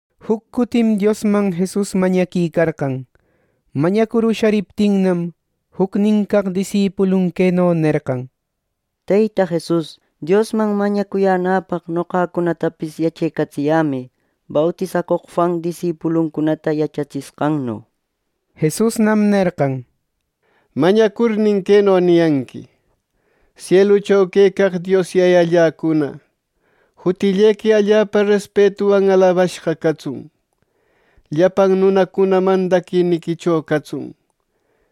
Juc cutim Diosman Jesus mañaquicarqan. Mañacur ushariptinnam, jucnin caq disipulun queno nerqan: —Teyta Jesus, Diosman mañacuyänäpaq, noqacunatapis yachecatsiyämë, bautisacoq Juan disipuluncunata yachatsishqanno. Jesusnam nerqan: —Mañacurnin queno niyanqui: ‘Sielucho quecaq Dios Yayalläcuna, jutillequi allapa respetuwan alabashqa catsun. Llapan nunacuna mandadiquicho catsun.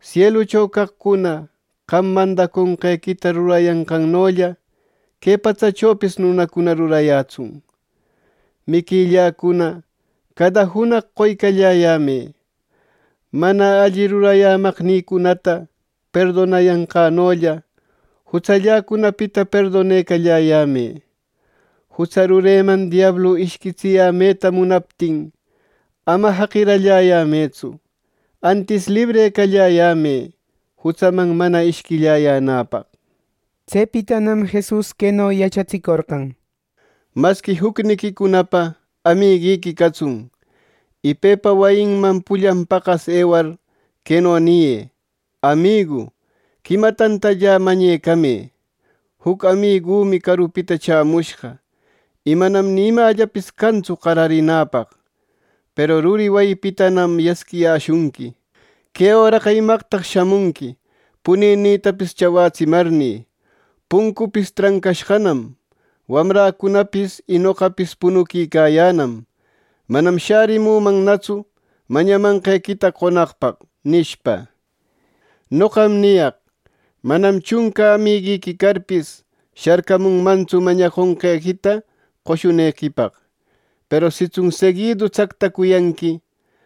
˻¡Sielucho caqcuna qam mandaconqequita rurayanqannolla, que patsachopis nunacuna rurayätsun!˼ Miquilläcuna cada junaq qoycalläyämë. Mana alli rurayämaqnïcunata perdonayanqänollä, jutsalläcunapita perdonecalläyämë. Jutsa rureman diablu ishquitsiyämeta munaptin ama jaqiralläyämëtsu; ˻antis librecalläyämë jutsaman mana ishquilläyänäpaq.˼’ Tsepitanam Jesus queno yachatsicorqan: —Masqui, jucniquicunapa amiguiqui catsun, y pepa wayinman pullan paqas ewar, queno niyë: ‘Amigu, quima tantallä mañecamë. Juc amigümi carupita chämushqa, y manam ni imällapis cantsu qararinäpaq.’ Peru ruri wayinpitanam yasquiyäshunqui: ‘Que öraqa ¿imaqtaq shamunqui puninïtapis chawätsimarnï? Puncüpis trancashqanam. Wamräcunapis y noqapis punuquicayänam. Manam shärimunätsu mañamanqequita qonaqpaq’ nishpa. Noqam niyaq: Manam chunca amiguiqui carpis, sharcamunmantsu mañaconqequita qoshunequipaq; peru sitsun seguidu tsactacuyanqui,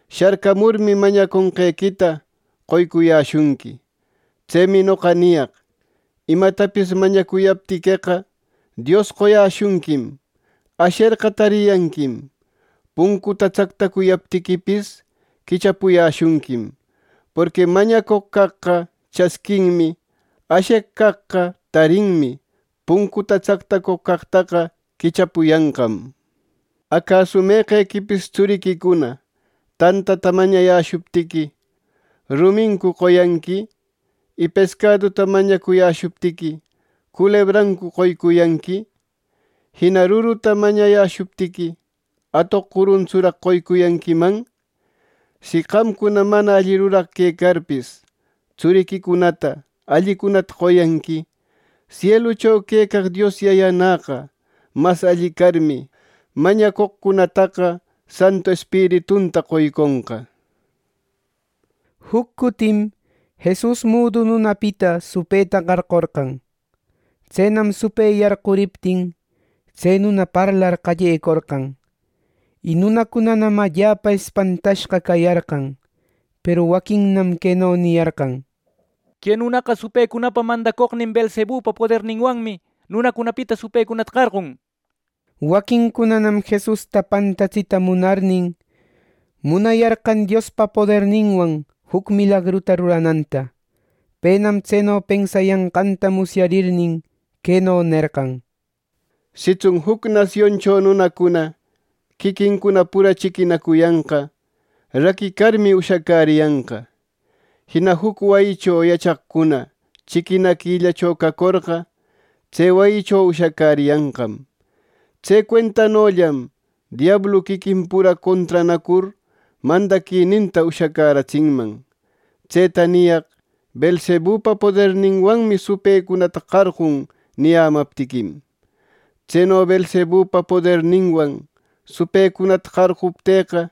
sharcamurmi mañacuyanqequita qoycuyäshunqui. Tsemi noqa niyaq: ¡Imatapis mañacuyaptiqueqa, Dios qoyäshunquim! ¡Asherqa, tariyanquim; puncuta tsactacuyaptiquipis, quichapuyäshunquim! Porqui mañacoq caqqa chasquinmi; asheq caqqa tarinmi; puncuta tacacoq caqtaqa quichapuyanqam. “Acasu meqequipis tsuriquicuna ˻tantata mañayäshuptiqui, ¿rumincu qoyanqui?˼ Y pescaduta mañacuyäshuptiqui, ¿culebrancu qoycuyanqui! Jina ruruta mañayäshuptiqui, ¿atoq curuntsuraq qoycuyanquiman? Si qamcuna mana alli ruraq quecarpis tsuriquicunata allicunata qoyanqui, sielucho quecaq Dios Yayanäqa mas alli carmi, mañacoqcunataqa Santu Espiritunta qoyconqa.” Juc cutim Jesus mudu nunapita supëta qarqorqan. Tsenam supë yarquriptin, tse nuna parlar qallecorqan, y nunacunanam allapa espantashqa cayarqan. Peru waquinnam queno niyarqan: —Que nunaqa supëcunapa mandacoqnin Beelzebupa poderninwanmi nunacunapita supëcunata qarqun. Waquincunanam Jesusta pantatsita munarnin, munayarqan Diospa poderninwan juc milagruta rurananta. Penam tseno pensayanqanta musyarnin, queno nerqan: —Sitsun juc nasioncho nunacuna quiquincuna pura chiquinacuyanqa, raquicarmi, ushacäriyanqa. Jina juc wayicho yachaqcuna chiquinaquillacho cacorqa, tse wayicho ushacäriyanqam. Tse cuentanollam diablu quiquin pura contranacur, mandaquininta ushacäratsinman. Tseta niyaq ‘Beelzebupa poderninwanmi supëcunata qarqun’ niyämaptiquim. Tseno Beelzebupa poderninwan supëcunata qarquptïqa,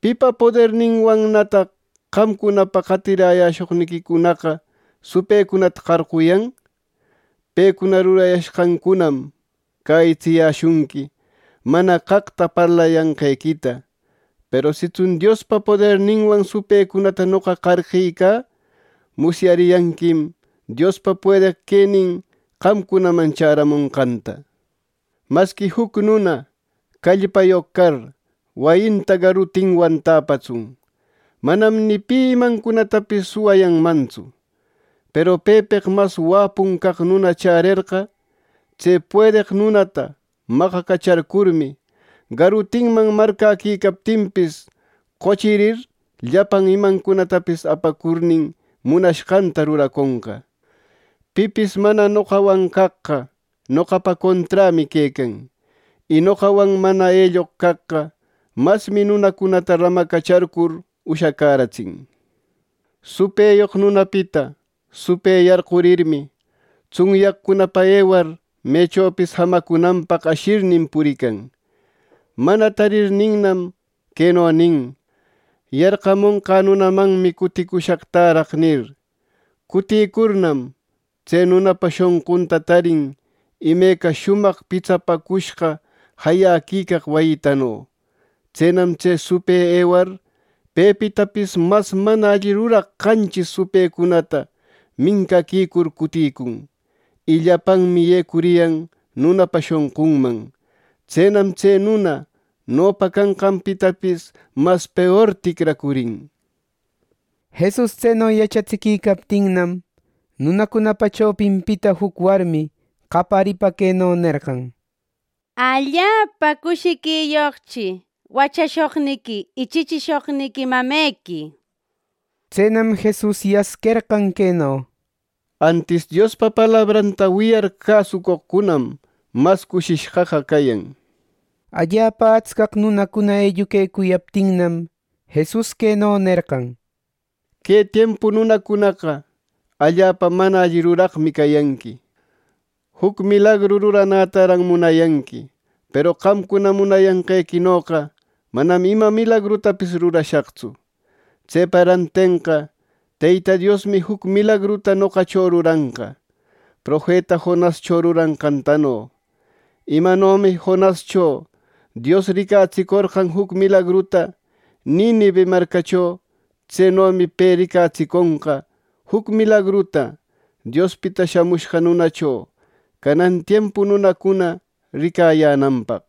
¿pipa poderninwannataq qamcunapa qatiräshoqniquicunaqa supëcunata qarquyan? Pecuna rurayashqancunam cäyitsiyäshunqui mana caqta parlayanqequita. Peru sitsun Diospa poderninwan supëcunata noqa qarqicä, musyariyanquim Diospa puedeq quenin qamcunaman chäramonqanta. “Masqui juc nuna callpayoq car, wayinta garuntinwan täpatsun, manam ni pi imancunatapis suwayanmantsu. Peru pepeq mas wapun caq nuna chärerqa, tse puedeq nunata maqacacharcurmi, garutinman marcäquicaptinpis qochirir, llapan imancunatapis apacurnin, munashqanta ruraconqa. “Pipis mana noqawan caqqa, noqapa conträmi quecan, y noqawan mana elloq caqqa, masmi nunacunata ramacacharcur ushacäratsin. “Supëyoq nunapita supë yarqurirmi, tsunyaqcunapa ewar, mechopis jamacunanpaq ashirnin purican. Mana tarirninnam, queno nin: ‘Yarqamonqä nunamanmi cuticushaq täraq’ nir. Cutïcurnam, tse nunapa shonqunta tarin imeca shumaq pitsapäcushqa jayaquicaq wayitano. Tsenam tse supë ewar pepitapis mas mana alli ruraq qanchis supëcunata mincaquicur cutïcun, y llapanmi yecuriyan nunapa shonqunman. Tsenam tse nuna nopa canqanpitapis mas peor ticracurin.” Jesus tseno yachatsiquicaptinnam, nunacunapa chopinpita juc warmi qayaripa queno nerqan: —¡Allapa cushiquiyoqchi wachashoqniqui y chichishoqniqui mamequi! —nir. Tsenam Jesus yasquerqan queno: —Antis Diospa palabranta wiyar cäsucoqcunam, mas cushishqaqa cayan. Allapa atscaq nunacuna elluquecuyaptinnam, Jesus queno nerqan: —Que tiempu nunacunaqa allapa mana alli ruraqmi cayanqui. ¡Juc milagru ruranätaran munayanqui! Peru qamcuna munayanqequinoqa manam ima milagrutapis rurashaqtsu. Tsepa rantenqa Teyta Diosmi juc milagruta noqacho ruranqa profeta Jonascho ruranqantano. Imanomi Jonascho Dios ricatsicorqan juc milagruta Ninive marcacho, tsenomi pe ricatsiconqa juc milagruta, Diospita Shamushqa Nunacho canan tiempu nunacuna ricayänanpaq.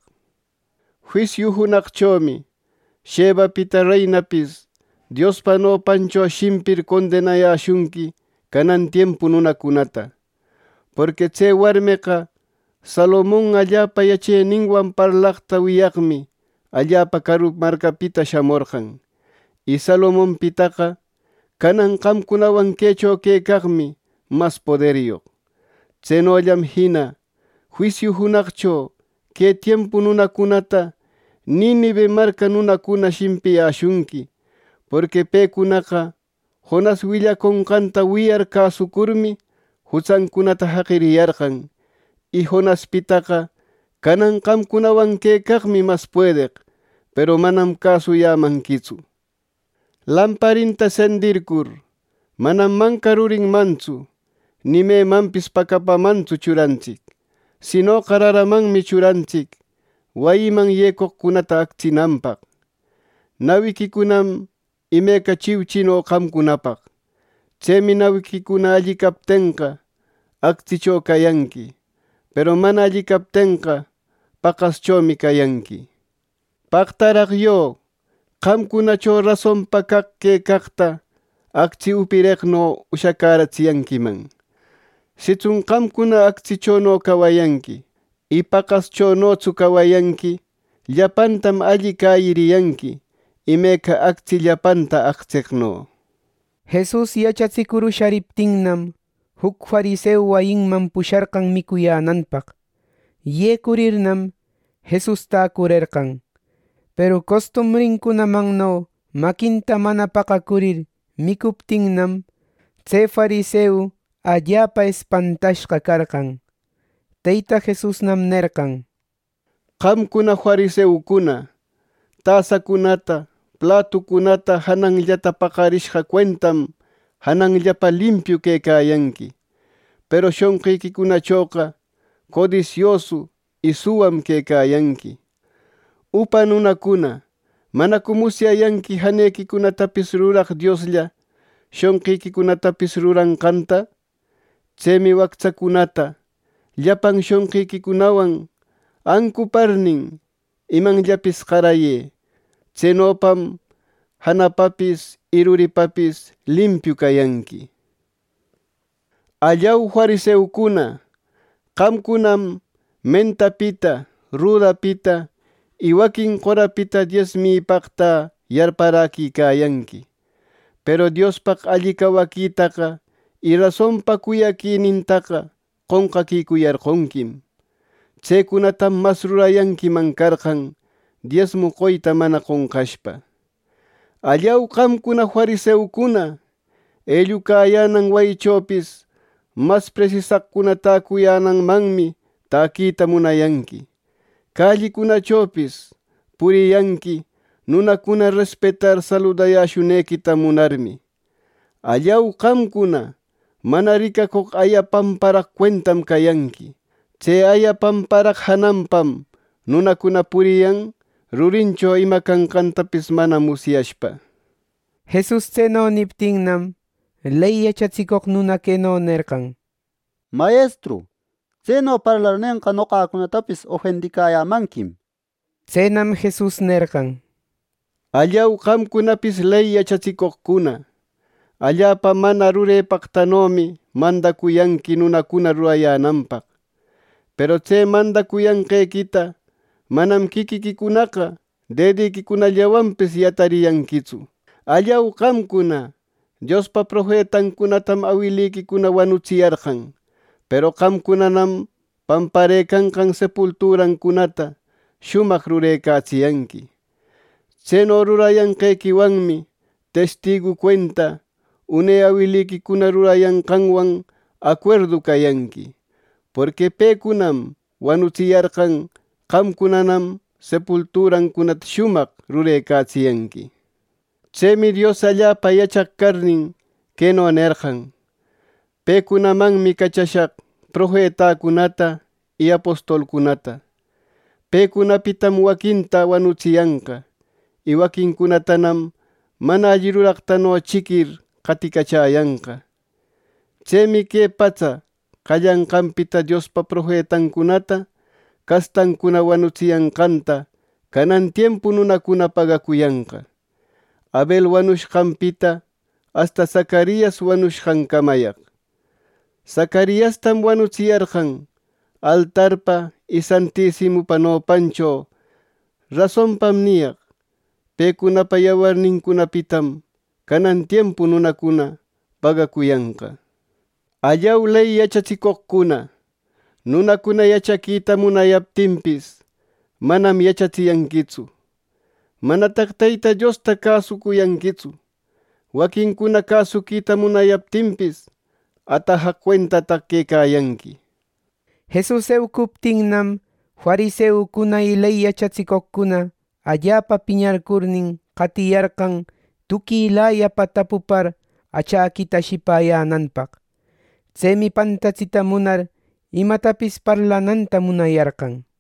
Juisiu junaqchomi, Shebapita reinapis Diospa nopancho shimpir condenayäshunqui canan tiempu nunacunata. Porqui tse warmeqa Salomon allapa yacheninwan parlaqta wiyaqmi allapa caru marcapita shamorqan, y Salomonpitaqa canan qamcunawan quecho quecaqmi mas poderyoq. Tsenollam jina juisiu junaqcho que tiempu nunacunata Ninive marca nunacuna shimpiyäshunqui, porqui pecunaqa Jonas willaconqanta wiyar cäsucurmi, jutsancunata jaqiriyarqan, y Jonaspitaqa canan qamcunawan quecaqmi mas puedeq, peru manam cäsuyämanquitsu. “Lamparinta sendircur, manam manca rurinmantsu, ni memanpis pacapamantsu churantsic; sinoqa raramanmi churantsic, wayiman yecoqcunata actsinanpaq. Nawiquicunam imeca chiuchino qamcunapaq. Tsemi nawiquicuna alli captenqa, actsicho cayanqui; peru mana alli captenqa, paqaschomi cayanqui. ¡Paqtaraq yö! Qamcunacho rasonpa caq quecaqta actsi upireqno ushacäratsiyanquiman. Sitsun qamcuna actsichono cawayanqui, y paqaschonotsu cawayanqui; llapantam alli cäyiriyanqui, imeca actsi llapanta actseqno.” Jesus yachatsicur ushariptinnam, juc fariseu wayinman pusharqan micuyänanpaq. Yecurirnam, Jesus täcurerqan. Peru costumbrincunamanno maquinta mana paqacurir, micuptinnam, tse fariseu allapa espantashqa carqan. Teyta Jesusnam nerqan: —Qamcuna fariseucuna, tasacunata, platucunata jananllata paqarishqa cuentam janallapa limpiu quecayanqui, peru shonqiquicunachoqa codisiosu y suwam quecayanqui. Upa nunacuna, ¿manacu musyayanqui janequicunatapis ruraq Dioslla shonqiquicunatapis ruranqanta? Tsemi wactsacunata llapan shonqiquicunawan ancuparnin, imanllapis qarayë. Tsenopam janapapis y ruripapis limpiu cayanqui. “¡Allau, fariseucuna! Qamcunam mentapita, rudapita y waquin qorapita diesmipaqtä yarparaquicayanqui, peru Diospaq alli cawaquitaqa y rasonpa cuyaquïnintaqa qonqaquicuyarqonquim. Tsecunatam mas rurayanquiman carqan, diesmu qoyta mana qonqashpa. “¡Allau, qamcuna fariseucuna! Ellucayänan wayichopis mas presisaqcuna täcuyänanmanmi täquita munayanqui. Callicunachopis puriyanqui, nunacuna respetar saludayäshunequita munarmi. “¡Allau, qamcuna! Mana ricacoq aya pamparaq cuentam cayanqui. Tse aya pamparaq jananpam nunacuna puriyan, rurincho ima canqantapis mana musyashpa.” Jesus tseno niptinnam, ley yachatsicoq nuna queno nerqan: —Mayestru, tseno parlarnenqa, noqacunatapis ofendiyämanquim. Tsenam Jesus nerqan: —¡Allau, qamcunapis, ley yachatsicoqcuna! Allapa mana rurepaqtanomi mandacuyanqui nunacuna rurayänanpaq; peru tse mandacuyanqequita manam quiquiquicunaqa dediquicunallawanpis yatariyanquitsu. “¡Allau, qamcuna! Diospa profetancunatam awiliquicuna wanutsiyarqan, peru qamcunanam pamparëcanqan sepulturancunata shumaq rurecatsiyanqui. Tseno rurayanqequiwanmi testigu cuenta, une awiliquicuna rurayanqanwan acuerdu cayanqui. Porqui pecunam wanutsiyarqan; qamcunanam sepulturancunata shumaq rurecatsiyanqui. Tsemi Dios allapa yachaq carnin, queno nerqan: ‘Pecunamanmi cachashaq profetacunata y apostolcunata. Pecunapitam waquinta wanutsiyanqa, y waquincunatanam mana alli ruraqtano chiquir qaticachäyanqa.’ “Tsemi que patsa qallanqanpita Diospa profetancunata castancuna wanutsiyanqanta, canan tiempu nunacuna pagacuyanqa, Abel wanushqanpita asta Zacarias wanushqancamayaq. Zacariastam wanutsiyarqan altarpa y santisimupa nopancho. Rasonpam niyaq: Pecunapa yawarnincunapitam canan tiempu nunacuna pagacuyanqa. “¡Allau, ley yachatsicoqcuna! Nunacuna yachaquita munayaptinpis, manam yachatsiyanquitsu. ¡Manataq Teyta Diosta cäsuyanquitsu y waquincuna cäsuquita munayaptinpis, atajaq cuentataq quecayanqui!” Jesus eucuptinnam fariseucuna y ley yachatsicoqcuna allapa piñarcurnin, qatiyarqan tuquilayapa tapupar achäquita ashipäyänanpaq. Tsemi pantatsita munar, imatapis parlananta munayarqan.